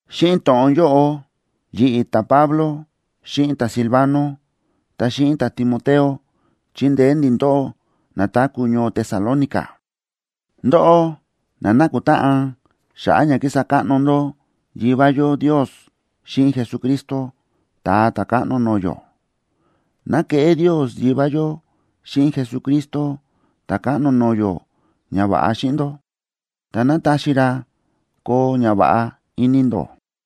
Xíꞌin to̱ꞌon yóꞌo yi̱ꞌi̱. ta̱Pablo, xíꞌin ta̱Silvano, ta xíꞌin ta̱Timoteo, chíndeé ndi̱ ndóꞌó na táku̱ ñoo Tesalónica, ndóꞌó na nákutáꞌan xa̱ꞌa̱ ña kísa káꞌno ndó Yivá yó Ndios xíꞌin Jesucristo, Ta̱a Ta̱káꞌno no̱o̱ yó. ¡Ná keꞌé Ndios Yivá yó xíꞌin Jesucristo Ta̱káꞌno no̱o̱ yó ñava̱ꞌa xíꞌin ndó, ta ná taxi ra koo ñava̱ꞌa ini ndó!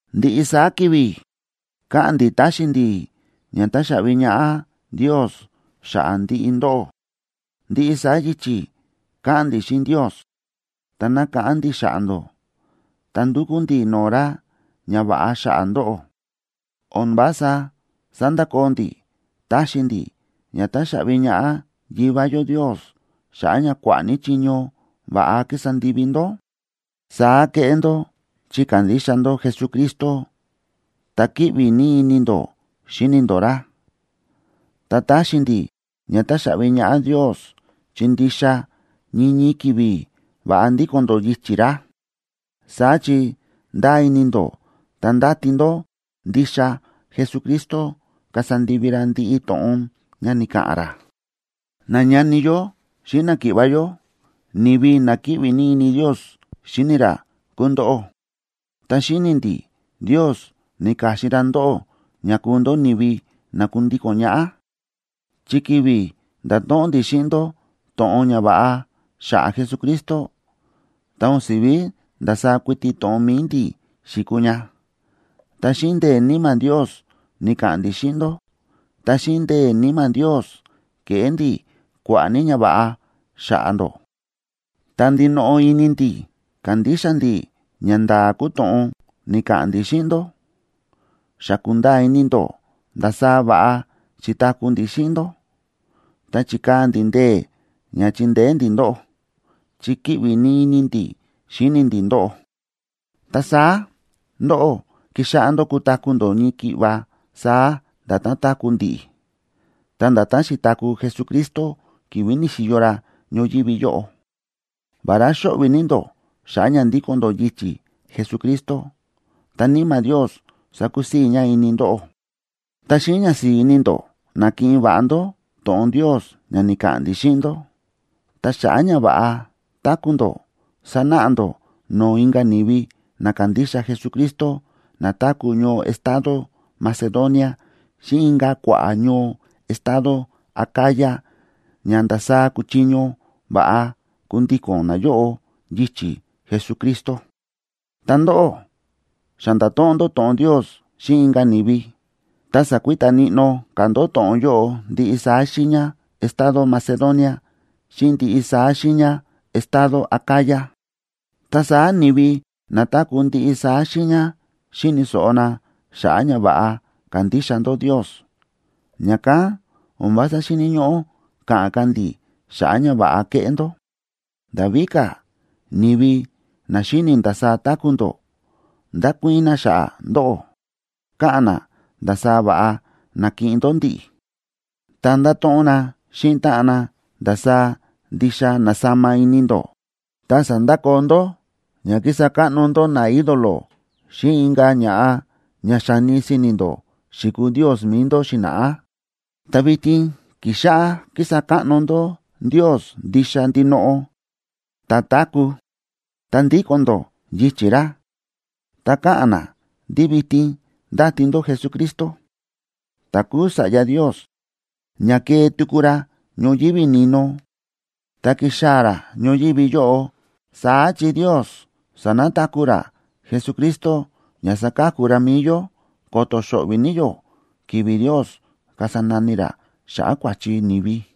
Ndiꞌi saá ki̱vi̱ káꞌa̱n ndi̱ táxi ndi̱ ña táxaꞌvi ñaꞌá Ndios xa̱ꞌa̱ ndiꞌi ndóꞌó. Ndiꞌi saá yichi̱ káꞌa̱n ndi̱ xíꞌin Ndios, ta nákáꞌán ndi̱ xa̱ꞌa̱ ndó, ta ndúkú ndi̱ no̱o̱ ra ñava̱ꞌa xa̱ꞌa̱ ndóꞌó. O̱n vása sándakoo ndi̱ taxi ndi̱ ña táxaꞌvi ñaꞌá Yivá yó Ndios xa̱ꞌa̱ ña kua̱ꞌa̱ ní chiño va̱ꞌa ki̱sa ndivi ndó. Saá kéꞌé ndó chi kándixa ndó Jesucristo, ta kíꞌvi ní ini ndó xíni ndó ra. Ta táxi ndi̱ ña táxaꞌvi ñaꞌá Ndios chi ndixa ñii ñii ki̱vi̱ va̱ꞌa ndíko̱n ndó yichi̱ ra, saá chi ndáa ini ndó ta ndáti ndó ndixa Jesucristo kasa ndivi ra ndiꞌi to̱ꞌon ña ni̱ka̱ꞌa̱n ra. Nañani yó xíꞌin náki̱ꞌva̱ yó, ni̱vi na kíꞌvi ní ini Ndios xíni ra kúu ndóꞌó, ta xíni̱ ndi̱ Ndios ni̱ka̱xin ra ndóꞌó ña kuu ndó ni̱vi na kundíko̱n ñaꞌá. Chi ki̱vi̱ nda̱to̱ꞌon ndi̱ xíꞌin ndó to̱ꞌon ñava̱ꞌa xa̱ꞌa̱ Jesucristo, ta o̱n si̱ví ndasaá kuiti to̱ꞌon mi̱i ndi̱ xi̱kuu ña, ta xíꞌin ndee̱ Níma̱ Ndios ni̱ka̱ꞌa̱n ndi̱ xíꞌin ndó ta xíꞌin ndee̱ Níma̱ Ndios ke̱ꞌé ndi̱ kua̱ꞌa̱ ní ñava̱ꞌa xa̱ꞌa̱ ndó. Ta ndinoꞌo ini ndi̱ kándixa ndi̱ ñanda̱a̱ kúu to̱ꞌon ni̱ka̱ꞌa̱n ndi̱ xíꞌin ndó. Xa kúnda̱a̱ ini ndó ndasaá va̱ꞌa xi̱taku̱ ndi̱ xíꞌin ndó, ta chi̱kaa̱ ndi̱ ndee̱ ña chíndeé ndi̱ ndóꞌó, chi kíꞌvi ní ini ndi̱ xíni ndi̱ ndóꞌó. Ta saá ndóꞌó ki̱xáꞌá ndó kutaku̱ ndó ñii ki̱ꞌva saá nda̱tán táku̱ ndi̱ꞌi̱, ta nda̱tán xi̱taku̱ Jesucristo ki̱vi̱ ni̱xi̱yo ra ñoyívi yóꞌo. Vará xóꞌvi̱ ní ndó xa̱ꞌa̱ ña ndíko̱n ndó yichi̱ Jesucristo, ta Níma̱ Ndios sákusii̱ ña ini ndóꞌó, ta xíꞌin ñasi̱i̱ ini ndó na̱kiꞌin va̱ꞌa ndó to̱ꞌon Ndios ña ni̱ka̱ꞌa̱n ndi̱ xíꞌin ndó. Ta xa̱ꞌa̱ ña va̱ꞌa táku̱ ndó, sánáꞌa ndó no̱o̱ inka̱ ni̱vi na kándixa Jesucristo na táku̱ ñoo estado Macedonia xíꞌin inka̱ kua̱ꞌa̱ ñoo estado Acaya ña ndasaá kuchiño va̱ꞌa kundíko̱n nayóꞌo yichi̱ Jesucristo. Ta ndóꞌó xa nda̱to̱ꞌon ndó to̱ꞌon Ndios xíꞌin inka̱ ni̱vi, ta sa̱kuita níꞌnó ka̱ ndó to̱ꞌon yóꞌo ndiꞌi saá xiiña estado Macedonia xíꞌin ndiꞌi saá xiiña estado Acaya. Ta saá ni̱vi na táku̱ ndiꞌi saá xiiña xi̱ni̱ so̱ꞌo na xa̱ꞌa̱ ña va̱ꞌa kándixa ndó Ndios, ña̱kán o̱n vása xíni̱ ñóꞌó ka̱ꞌa̱n ka̱ ndi̱ xa̱ꞌa̱ ñava̱ꞌa kéꞌé ndó. Nda̱ víka̱, ni̱vi na xíni ndasaá táku̱ ndó, ndákuii̱n na xa̱ꞌa̱ ndóꞌó, káꞌa̱n na ndasaá va̱ꞌa na̱kiꞌin ndó ndi̱ꞌi̱. Ta ndáto̱ꞌon na xíꞌin táꞌan na ndasaá ndixa na̱sama ini ndó, ta sa̱ndakoo ndó ña ki̱sa káꞌno ndó ñaídolo xíꞌin inka̱ ña̱ꞌa ña xa̱ni si̱ni̱ ndó xi̱kuu ndios mi̱i ndó xi̱na̱ꞌá, ta vitin ki̱xáꞌá kísa káꞌno ndó Ndios ndixa ndinoꞌo ta̱táku̱, ta ndíko̱n ndó yichi̱ ra. Ta káꞌa̱n na ndí vitin ndáti ndó Jesucristo, ta kúu Sa̱ꞌya Ndios, ña kee tuku ra ñoyívi ni̱no, ta kixaa̱ ra ñoyívi yóꞌo, saá chi Ndios sa̱nataku̱ ra Jesucristo ña saka̱ku ra mi̱i yó, ko̱to̱ xo̱ꞌvi̱ ní yó ki̱vi̱ Ndios kasa nani ra xa̱ꞌa̱ kua̱chi ni̱vi.